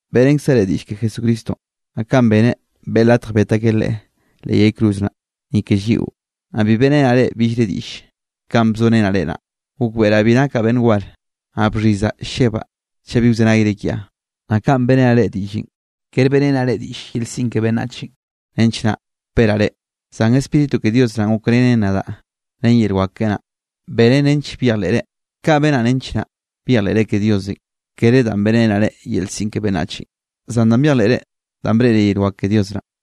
Beꞌrenkzaꞌ reꞌ diꞌll ke Jesucristonꞌ, naꞌ kanꞌ beneꞌ beꞌe latj bet akeꞌ Leꞌe leꞌ yay cruz naꞌ, ni ke lliꞌo, naꞌ bi beꞌrenaꞌ reꞌ billre diꞌlle. Kanꞌ bzorenaꞌ reꞌ naꞌ, gokbeꞌraꞌ bi nakaꞌ beꞌnn war, naꞌ bxhizaꞌ llebaꞌ chaꞌ bi wzenayre kiaꞌ. Naꞌ kanꞌ beꞌrenaꞌ reꞌ diꞌllenꞌ, kere beꞌrenaꞌ reꞌ diꞌll yel siꞌn ke beꞌnnachenꞌ nench naꞌ wperaꞌ reꞌ. Zan Spíritu ke Dios naꞌn gokrenen nadaꞌ ren yel wak keꞌe naꞌ, benen nench byejleꞌre. Kaꞌ benaꞌ nench naꞌ byejleꞌre ke Diosenꞌ, kere danꞌ bénere yel siꞌn ke beꞌnnachenꞌ, zan danꞌ byejleꞌre danꞌ breꞌre yel wak ke Dios naꞌ.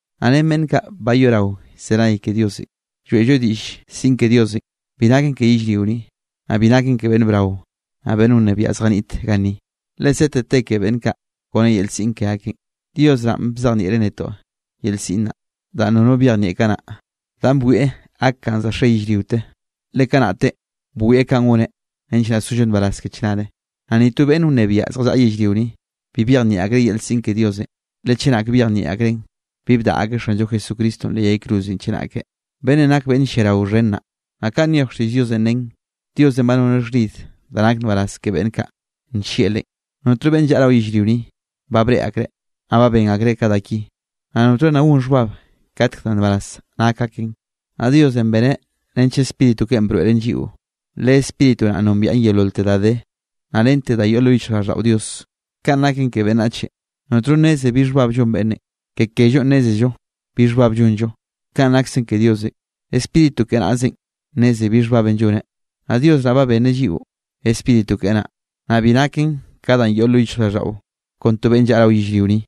Naꞌ ren beꞌnn kaꞌ ba yoꞌrao llzenay ke Diosenꞌ, lloeꞌllo diꞌll siꞌn ke Dios, bi naken ke yellrio ni, naꞌ bi naken ke beꞌnn brao, naꞌ beꞌnn wnebiaꞌ zjaniꞌt ganni, le sete te ke beꞌnn kaꞌ kone yel siꞌn ke akeꞌn. Dios naꞌ ba bzejnieꞌreꞌ netoꞌ yel siꞌn naꞌ, danꞌ nono byejnieꞌ kanaꞌ, danꞌ bwieꞌ gak kanꞌ za xe yellriote, le kanaꞌtenꞌ bwieꞌ kanꞌ goneꞌ nench naꞌ sollo nbaraz ke chnare. Naꞌ ni to beꞌnn wnebiaꞌ zjallaꞌa yellrio ni, bi byejnieꞌ akreꞌ yel siꞌn ke Diosenꞌ, le chenak byejnieꞌ akreꞌn, bi bdaꞌa akeꞌ Xanllo Jesucristonꞌ leꞌ yay cruzenꞌ chenake, beꞌnnenꞌ nak beꞌnn lliarao xhen naꞌ. Naꞌ kanꞌ nyoj xtiꞌll Diosenꞌ nen: Diosenꞌ ba noneꞌ xhnid da nak nbaraz ke beꞌnn kaꞌ nllieꞌ Leꞌen. Notno beꞌnn llaꞌa rao yellrio ni, ba breꞌe akreꞌ, naꞌ ba ben akreꞌ ka da ki. Naꞌ notno nna gon xhbab katk da nbaraz nak aken. Naꞌ Diosenꞌ beneꞌ nench Spíritu keꞌen broeꞌren lliꞌo, le Spíritu naꞌn nombiaꞌ yeololte da de, naꞌ rente da yoꞌ lo yichjraꞌlldaꞌo Dios. Kanꞌ naken ke beꞌnnachenꞌ, notno nneze bi xhbab llon beꞌnne, ke kellonꞌ nnézello bi xhbab llonllo. Kanꞌ naksen ke Diosenꞌ, Spíritu keꞌe naꞌzenꞌ nnezen bi xhbab lloneꞌ. Naꞌ Dios naꞌ ba benneꞌ lliꞌo Spíritu keꞌe naꞌ, naꞌ bi naken ka danꞌ yoꞌ lo yichjraꞌlldaꞌo kon to beꞌnn llaꞌa rao yellrio ni,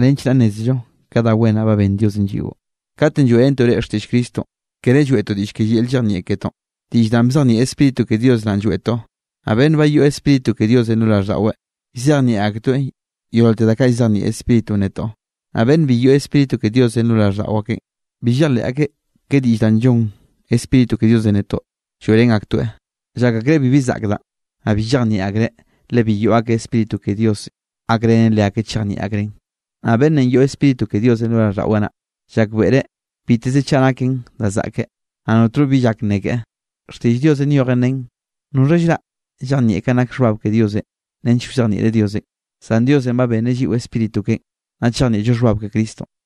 nench naꞌ nnézello ke da wen naꞌ ba benn Diosenꞌ lliꞌo. Katenꞌ lloeꞌrentoꞌ reꞌ xtiꞌll Cristonꞌ, kere lloeꞌtoꞌ diꞌll ke yel llejnieꞌ ketoꞌn, diꞌll da bzejnieꞌ Spíritu ke Dios naꞌn lloeꞌtoꞌ, naꞌ beꞌnn ba yoꞌ Spíritu ke Diosenꞌ lo raꞌlldaꞌweꞌ, llzejnieꞌ aketoeꞌ yeololte da kaꞌ llzejnieꞌ Spíritunꞌ netoꞌ. Naꞌ beꞌnn bi yoꞌ Spíritu ke Diosenꞌ lo raꞌlldaꞌo akeꞌ, bi llejleꞌ akeꞌ ke diꞌll danꞌ llonn Spíritu ke Diosenꞌ netoꞌ lloeꞌrén aktoeꞌ, llak akreꞌ bibi zaꞌk danꞌ. Naꞌ bi llejnieꞌ akreꞌ le bi yoꞌ akeꞌ Spíritu ke Diosenꞌ gakrenen leakeꞌ chejnieꞌ akreꞌn. Naꞌ beꞌnnenꞌ yoꞌ Spíritu ke Diosenꞌ lo raꞌlldaꞌweꞌ naꞌ, llakbeꞌreꞌ biteze chaꞌ naken da zaꞌke, naꞌ notno bi llak nne keꞌe. Xtiꞌll Diosenꞌ nyojen nen: “¿Noxha llraꞌ llejnieꞌ kanꞌ nak xhbab ke Diosenꞌ nench wzejnieꞌreꞌ Diosenꞌ?” Zan Diosenꞌ ba benneꞌ lliꞌo Spíritu keꞌen, naꞌ chejnieꞌllo xhbab ke Cristonꞌ.